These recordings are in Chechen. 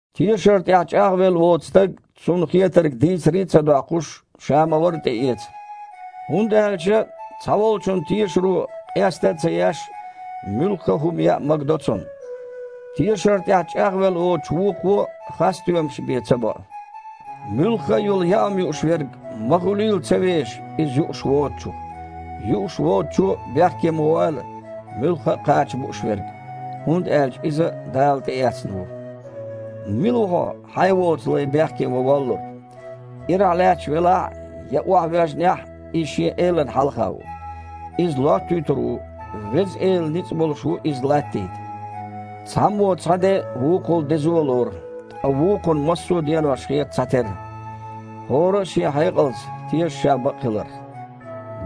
Тешар тІехь чІагІвелла воцу стаг, цунна хетарг дийцаре а ца доккхуш, ша ма-варра тІеэца. ХІунда аьлча цхьаволчун тешаро, къеста а ца еш, муьлхха а хІума яа магадо цунна. Тешар тІехь чІагІвелла воцучу вукхо хасстоьмаш бен ца боу. Муьлхха а йолу яа хІума юуш верг ма хуьлийла ца вешаш иза юуш воцучух. Юуш воцучо а бехке ма войла муьлхха а кхача бууш верг, хІунда аьлча иза а Дала тІеэцна ву. Мила ву хьо, хьайн воцу лай бехке ван воллург? Ирахь лаьтташ велахь а, я охьавоьжнехь а, иза шен элана хьалха ву. Иза лоттуьйтур ву: Веза Эла ницкъ болуш ву иза латтийта. Цхьаммо цхьа де вукхул дезо лору, ткъа вукхунна массо а денош хета цхьатерра. ХІора а шен хьекъалца теша ша бакъхиларх.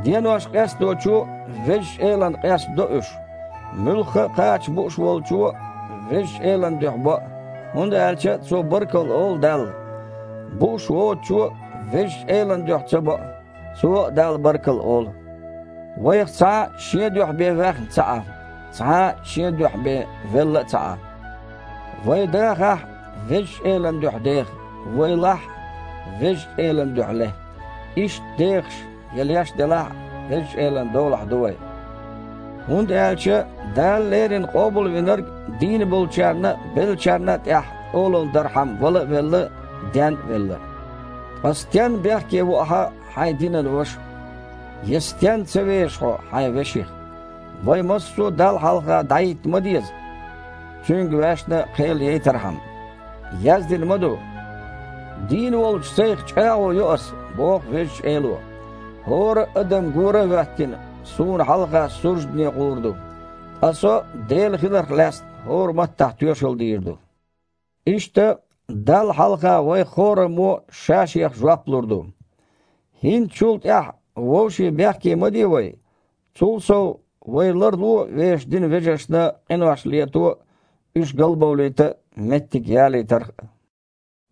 Денош къесточо Везачу Элана къестадо уьш. Муьлхха а кхача бууш волчо Везачу Элан дуьхьа боу, хІунда аьлча цо баркалла олу Далла. Бууш воцучо а Везачу Элан дуьхьа ца боу, цо а Далла баркалла олу. Вайх цхьа а шен дуьхьа бен ваьхна ца Іа, цхьа а шен дуьхьа бен велла ца Іа. Вай дахахь а, Везачу Элан дуьхьа деха, вай лахь а, Везачу Элан дуьхьа ле. Иштта, дехаш я леш делахь а, Везачу Элан долахь ду вай. ХІунда аьлча Дала леррина Къобалвинарг дийна болчарна а, беллачарна а тІехь олалла дархьама вала а велла, ден а велла. Ткъа стенна бехке во ахьа хьайн динан ваша? Я стенна ца веша хьо хьайн веших? Вай массо а Далла хьалха дІахІитта ма деза, Цуьнга ваьшна кхел яйтархьама. Яздина ма ду: «Дийна волчу Сайх чІагІо йо Аса, боху Везачу Эло, хІора а адам, гора а хІоьттина, Суна хьалха суждане гІур ду, ткъа Со Дела хиларх лаьцна хІора маттахь тоьшалла дийр ду». Иштта, Далла хьалха вайх хІораммо а ша-шех жоп лур ду. ХІинца чул тІаьхьа вовшийн бехке ма де вай. Цул сов, вай ларло вешан динан вежаршна къинош лето а, уьш галбовлийта а меттиг ялийтарх а.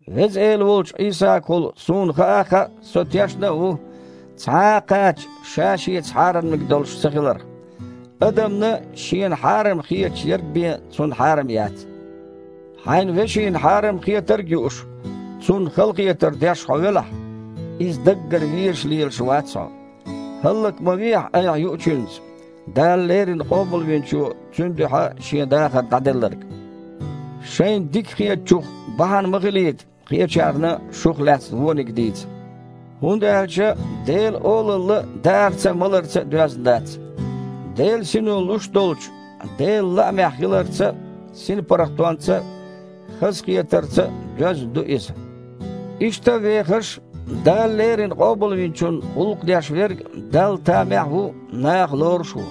Веза Эла волчу Іийсагахула суна хаа а хаьа, со тешна а ву цхьа а кхача ша-шеца хьарамниг долуш ца хиларх. Адамна, шена хьарам хеташ ерг бен, цунна хьарам яц. Хьайн вешина хьарам хетарг а юуш, цунна халахетар деш хьо велахь, иза даггара везаш лелаш вац хьо. ХІаллак ма вехьа айхьа юучуьнца Дала леррина Къобалвинчо цуьнан дуьхьа Шен дахар дІаделларг. Шайна дика хетачух бахьана ма хилийта кхечарна шух лаьцна вониг дийца. ХІунда аьлча Делан Олалла даарца а, маларца а доьзна дац. Делан Сино луш долчу Делан лаамехь хиларца а, синпаргІатонца а, хазахетарца а доьзна ду иза. Иштта а вехаш, Дала леррина Къобалвинчунна гІуллакх деш верг Далла тамехь а ву, наха лоруш а ву.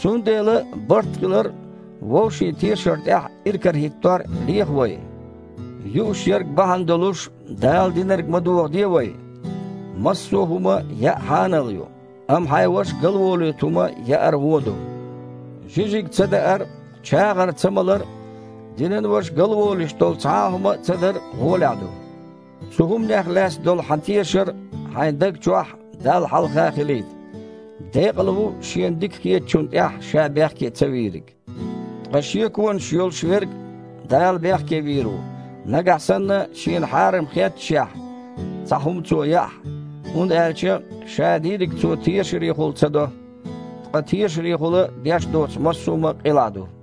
Цундела барт хилар а, вовшийн тешар тІехь иракарахІиттор а леха вай. Юуш ерг бахьана долуш, Дала динарг ма дохаде вай. Массо а хІума яа хьанал ю, амма хьайн ваша галволуьйту хІума яар вон ду. Жижиг цадаар а, чагІар цамалар а, динан ваша галволуьйтуш долу цхьа а хІума цадар гІолехь ду. Цу хІуманех лаьцна долу хьан тешар хьайн даг чохь а, Далла хьалха а хилийта. Декъала ву шена дика хетачунна тІехь ша бехке цавийриг. Ткъа шеконаш йолуш верг Дала бехке вийр ву, нагахь санна шена хьарам хетташехь, цхьа хІума цо яахь, хІунда аьлча ша дийриг цо тешарехула ца до, ткъа тешарехула деш доцу массо а хІума къилахь ду.